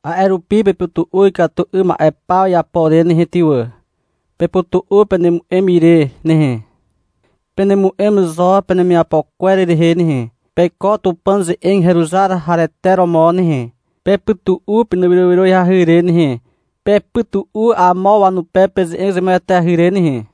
A'e rupi pepytu'u ikatu 'ym ma'e paw iapo re nehe ty wà. Pepytu'u penemu'em ire nehe. Penemu'em zo penemiapo kwer rehe nehe. Peiko Tupàn ze'eg heruzar harete romo nehe. Pepytu'u penewyrowyroahy re nehe. Pepytu'u amo wanupe peze'eg zemueteahy re nehe.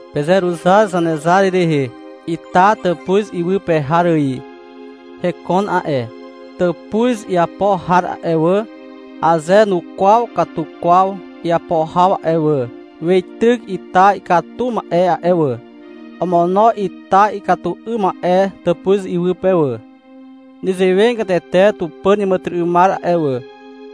Pezeruzar Zanezar rehe. Ita tàpuz iwy pe har ài hekon a'e. Tàpuz iapo har a'e wà, aze nukwaw katu kwaw iapo haw a'e wà, weityk ita ikatu ma'e a'e wà. Omono ita ikatu 'ym ma'e tàpuz iwy pe wà. Nezewegatete Tupàn iàmàtyry'ymar a'e wà,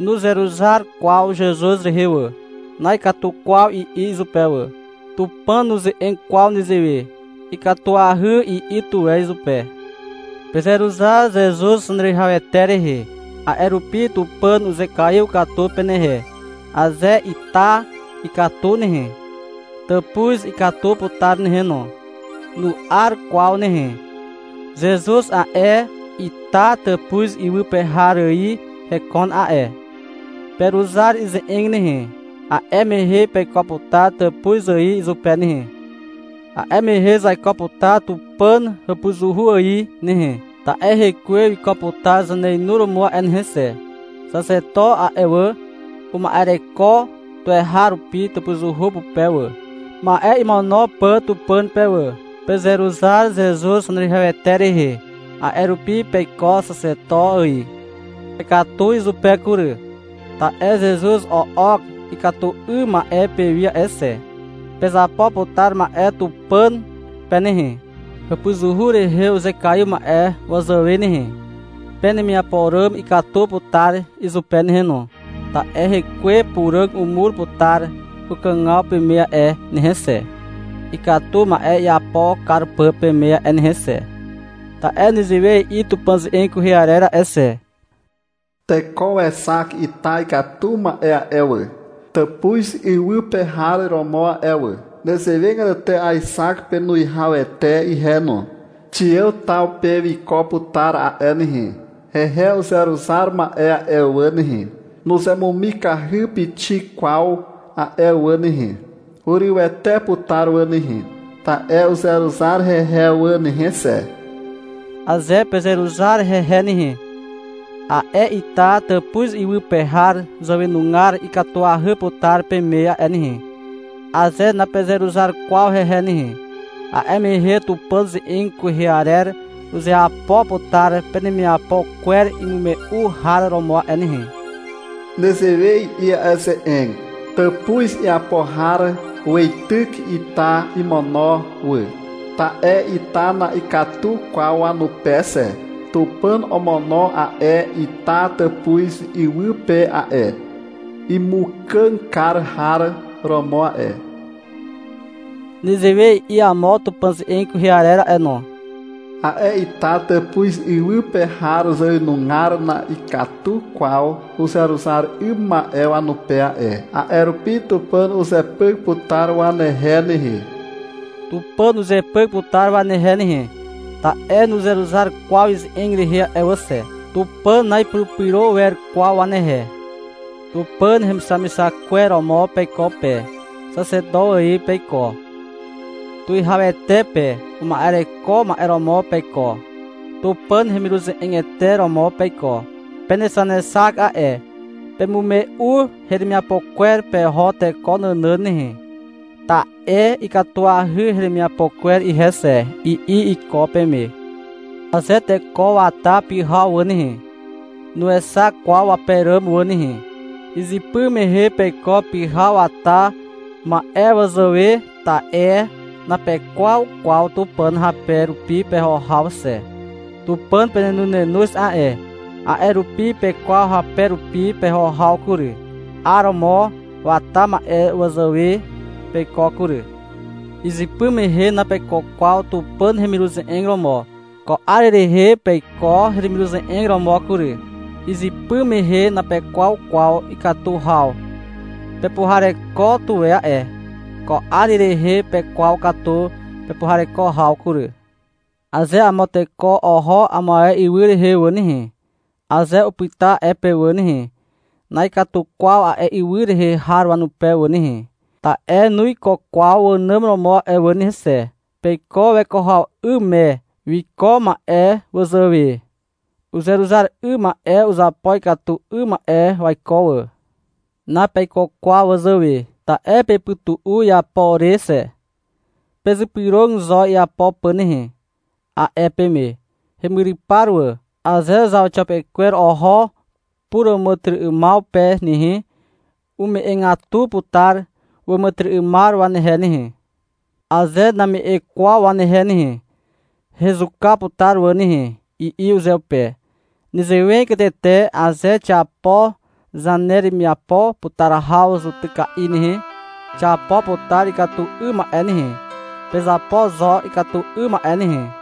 nuzeruzar kwaw Zezuz rehe wà. — Na'ikatu kwaw, i'i izupe wà. Tupàn nuze'eg kwaw nezewe. — Ikatuahy, i'i tuwe izupe. Pezeruzar Zezuz Zaneruwihawete rehe. A'e rupi Tupàn uzekaiw katu penehe. Aze ita ikatu nehe, tàpuz ikatu putar nehe no. Nu'ar kwaw nehe. Zezuz a'e, ita tàpuz iwy pe har ài hekon a'e. Peruzar ize'eg nehe. A'e mehe peiko putar tàpuz ài izupe nehe. A'e mehe zaiko putar Tupàn hàpuzuhu ài nehe, ta'e Hekwe wiko putar zaneinuromo a'e nehe xe. Xaxeto a'e wà, uma'ereko tuweharupi tàpuzuhu pupe wà, ma'e imono pà Tupàn pe wà. Pezeruzar Zezuz Zaneruwihawete rehe. A'e rupi peiko Xaxeto ài. Pekatu izupe kury, ta'e Zezuz o'ok ikatu 'ym ma'e pewi a'e xe. Pezapo putar ma'e Tupàn pe nehe, hàpuzuhu rehe uzekaiw ma'e wazàwe nehe. Penemiapo ràm ikatu putar izupe nehe no. Ta'e Hekwe Puràg umur putar ukàgaw peme a'e nehe xe, ikatu ma'e iapo kar pà peme a'e nehe xe. Ta'e nezewe i'i Tupàn ze'eg kwehe arer a'e xe. — Teko wexak ita ikatu ma'e a'e wà, tàpuz iwy pe har romo a'e wà. Nezewegatete aexak penuwihawete ihe no. Xiàw taw pe wiko putar a'e nehe. Hehe uzeruzar ma'e a'e wà nehe, nuzemumikahy pixik kwaw a'e wà nehe. Hurywete putar wà nehe, ta'e uzeruzar hehe wà nehe xe. Aze pezeruzar hehe nehe, a'e ita tàpuz iwy pe har zàwenugar ikatuahy putar peme a'e nehe. Aze napezeruzar kwaw hehe nehe, a'e mehe Tupàn ze'eg kwehe arer uzeapo putar penemiapo kwer imume'u har romo a'e nehe. Nezewe i'i a'e ze'eg. — Tàpuz iapo har weityk ita imono wà, ta'e ita na'ikatu kwaw wanupe xe. Tupàn omono a'e ita tàpuz iwy pe a'e, Imukàg kar har romo a'e. Nezewe i'i amo Tupàn ze'eg kwehe arer a'e no. A'e ita tàpuz iwy pe har zàwenugar na'ikatu kwaw uzeruzar 'ym ma'e wanupe a'e. A'e rupi Tupàn uzepyk putar wanehe nehe. Tupàn uzepyk putar wanehe nehe, ta'e nuzeruzar kwaw ize'eg rehe a'e wà xe. Tupàn na'ipurupyro wer kwaw wanehe. Tupàn hemixamixak kwer romo peiko pe. Xaxeto ài peiko, tuwihawete pe uma'ereko ma'e romo peiko. Tupàn hemiruze'egete romo peiko. Penexanexak a'e. — Pemume'u heremiapo kwer peho teko nànàn nehe, ta'e ikatuahy heremiapo kwer ihe xe, i'i iko peme. Aze teko wata pyhaw wà nehe, nuexak kwaw wape ràm wà nehe. Izypy mehe peiko pyhaw wata ma'e wazàwe, ta'e napekwaw kwaw Tupàn hape rupi peho haw xe. Tupàn penenonenoz a'e. A'e rupi pekwaw hape rupi peho haw kury. 'Aromo wata ma'e wazàwe peiko kury. Izypy mehe napeiko kwaw Tupàn hemiruze'eg romo. Ko 'ar rehe peiko hemiruze'eg romo kury. Izypy mehe napekwaw kwaw ikatu haw. Pepuhareko tuwe a'e. Ko 'ar rehe pekwaw katu pepuhareko haw kury. Aze amo teko oho amo ae ywy rehe wà nehe, aze upyta a'e pe wà nehe, na'ikatu kwaw a'e ywy rehe har wanupe wà nehe, ta'e nuiko kwaw wànàm romo a'e wà nehe xe. Peiko weko haw 'ym me wiko ma'e wazàwe. Uzeruzar 'ym ma'e uzapo ikatu 'ym ma'e waiko wà. Napeiko kwaw wazàwe, ta'e pepytu'u iapo re xe. Pezypyrog zo iapo pà nehe, a'e peme, hemyrypar wà. Aze zauxiapekwer oho puràmàtyry'ymaw pe nehe, ume'egatu putar wàmàtyry'ymar wanehe nehe. — Aze name'e kwaw wanehe nehe, hezuka putar wà nehe, i'i uzeupe. Nezewegatete aze xiapo zaneremiapo putar haw zutyka'i nehe, xiapo putar ikatu 'ym ma'e nehe. Pezapo zo ikatu 'ym ma'e nehe.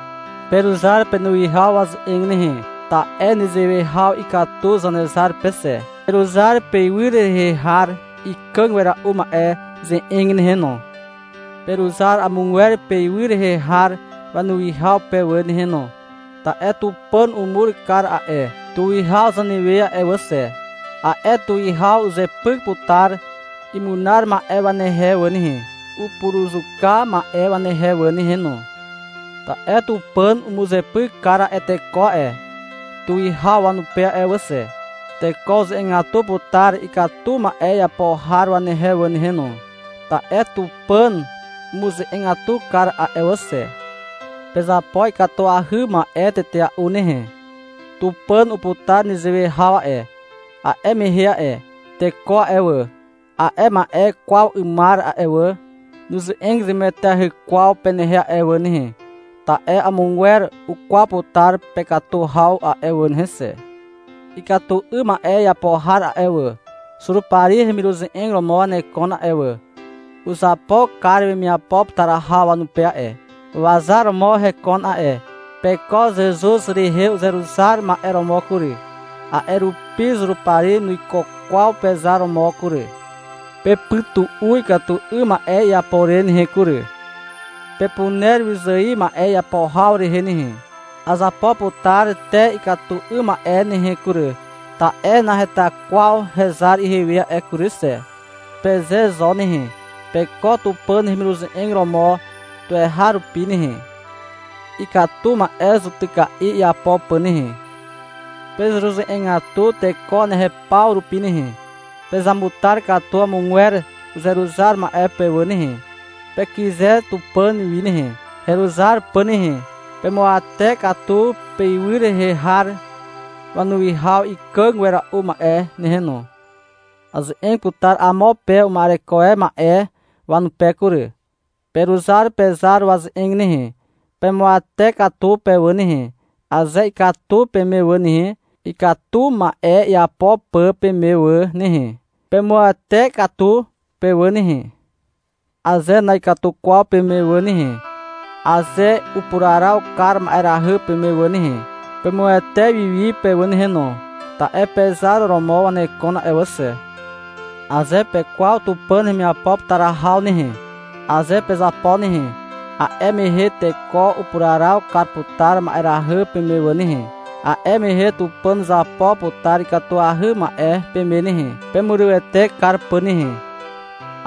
Peruzar penuwihaw waze'eg nehe. Ta'e nezewe haw ikatu Zanezar pe xe. Peruzar peywy rehe har ikàg wera'u ma'e ze'eg nehe no. Peruzar amogwer peywy rehe har wanuwihaw pe wà nehe no. Ta'e Tupàn umur kar a'e tuwihaw zanewe a'e wà xe. A'e tuwihaw uzepyk putar imunar ma'e wanehe wà nehe, upuruzuka ma'e wanehe wà nehe no. Ta'e Tupàn umuzepyk kar a'e teko a'e tuwihaw wanupe a'e wà xe. Teko uze'egatu putar ikatu ma'e iapo har wanehe wà nehe no, ta'e Tupàn umuze'egatu kar a'e wà xe. Pezapo ikatuahy ma'e tetea'u nehe. Tupàn uputar nezewe haw a'e. A'e mehe a'e teko a'e wà, a'e ma'e kwaw 'ymar a'e wà, nuze'eg zemueteahy kwaw penehe a'e wà nehe, ta'e amogwer ukwaw putar pekatu haw a'e wà nehe xe. Ikatu 'ym ma'e iapo har a'e wà, Zurupari hemiruze'eg romo wanekon a'e wà. Uzapo kar wemiapo putar haw wanupe a'e. Wazar romo hekon a'e. Peiko Zezuz rehe uzeruzar ma'e romo kury. A'e rupi Zurupari nuiko kwaw pezar romo kury. Pepytu'u ikatu 'ym ma'e iapo re nehe kury. Pepuner wyzài ma'e iapo haw rehe nehe. — Azapo putar te ikatu 'ym ma'e nehe kury, ta'e naheta kwaw hezar ihewe a'e kury xe, peze zo nehe. Peiko Tupàn hemiruze'eg romo tuweharupi nehe, ikatu ma'e zutyka'i iapo pà nehe. Pezeruze'egatu teko wanehe upaw rupi nehe. Pezamutar katu amogwer uzeruzar ma'e pe wà nehe. Pekyze Tupàn wi nehe, heruzar pà nehe. Pemuawate katu peywy rehe har wanuwihaw ikàg wera'u ma'e nehe no. Aze'eg putar amo pe uma'ereko e ma'e wanupe kury. Peruzar pezar waze'eg nehe. Pemuawate katu pe wà nehe. Aze ikatu peme wà nehe, ikatu ma'e iapo pà peme wà nehe, pemuawate katu pe wà nehe. Aze na'ikatu kwaw peme wà nehe, aze upuraraw kar ma'erahy peme wà nehe, pemuawate wiwi pe wà nehe no. (Ta'e pezar romo wanekon a'e wà xe.) Aze pekwaw Tupàn hemiapo putar haw nehe, aze pezapo nehe, a'e mehe teko upuraraw kar putar ma'erahy peme wà nehe. A'e mehe Tupàn uzapo putar ikatuahy ma'e peme nehe, pemurywete kar pà nehe.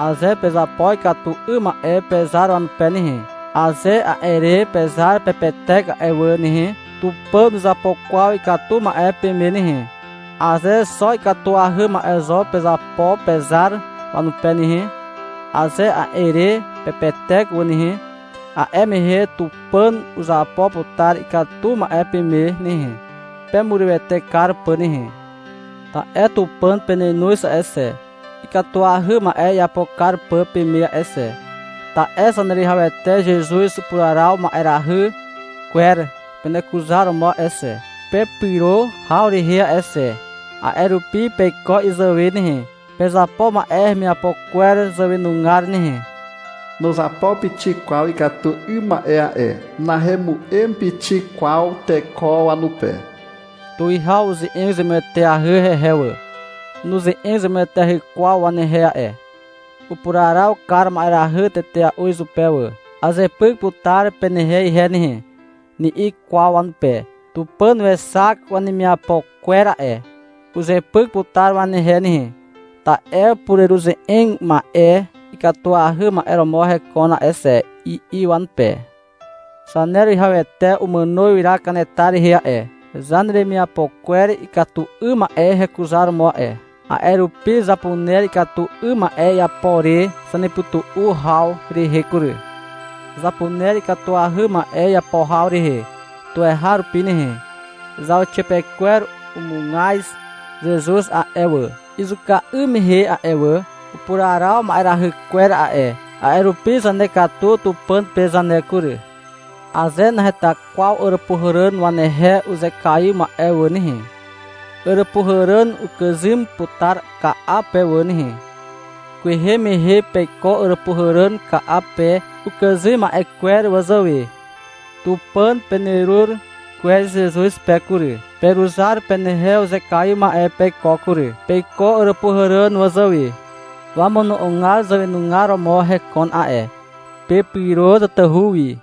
Aze pezapo ikatu 'ym ma'e pezar wanupe nehe, aze a'e re pezar pepetek a'e wà nehe, Tupàn nuzapo kwaw ikatu ma'e peme nehe. Aze xo ikatuahy ma'e zo pezapo pezar wanupe nehe, aze a'e re pepetek wà nehe, a'e mehe Tupàn uzapo putar ikatu ma'e peme nehe, pemurywete kar pà nehe. Ta'e Tupàn penenoz a'e xe, ikatuahy ma'e iapo kar pà peme a'e xe. Ta'e Zaneruwihawete Zezuz upuraraw ma'erahy kwer penekuzaromo a'e xe, pepyro haw rehe a'e xe. A'e rupi, peiko izàwe nehe. Pezapo ma'e hemiapo kwer zàwenugar nehe. Nuzapo pixik kwaw ikatu 'ym ma'e a'e. Nahemu'em pixik kwaw teko wanupe. Tuwihaw uze'eg zemueteahy hehe wà. Nuze'eg zemueteahy kwaw wanehe a'e. Upuraraw kar ma'erahy tetea'u izupe wà. — Azepyk putar penehe ihe nehe, ni'i kwaw wanupe. — Tupàn wexak wanemiapo kwer a'e. Uzepyk putar wanehe nehe, ta'e pureruze'eg ma'e ikatuahy ma'e romo hekon a'e xe, i'i wanupe. Zaneruwihawete umàno ywyra kanetar rehe a'e, zaneremiapo kwer ikatu 'ym ma'e hekuzaromo a'e. A'e rupi zapuner ikatu 'ym ma'e iapo re zanepytu'u haw rehe kury. Zapuner ikatuahy ma'e iapo haw rehe tuweharupi nehe. Zauxiapekwer umugaz Zezuz a'e wà, izuka 'ym mehe a'e wà. Upuraraw ma'erahy kwer a'e, a'e rupi zanekatu Tupàn pe zane kury. Aze naheta kwaw Àràpuhàràn wanehe uzekaiw ma'e wà nehe, Àràpuhàràn ukàzym putar ka'a pe wà nehe. Kwehe mehe peiko Àràpuhàràn ka'a pe ukàzym ma'e kwer wazàwe. Tupàn penerur kwez Zezuz pe kury. Peruzar penehe uzekaiw ma'e peiko kury. Peiko Àràpuhàràn wazàwe. Wamono'ogar zàwenugar romo hekon a'e. Pepyro tatahu wi.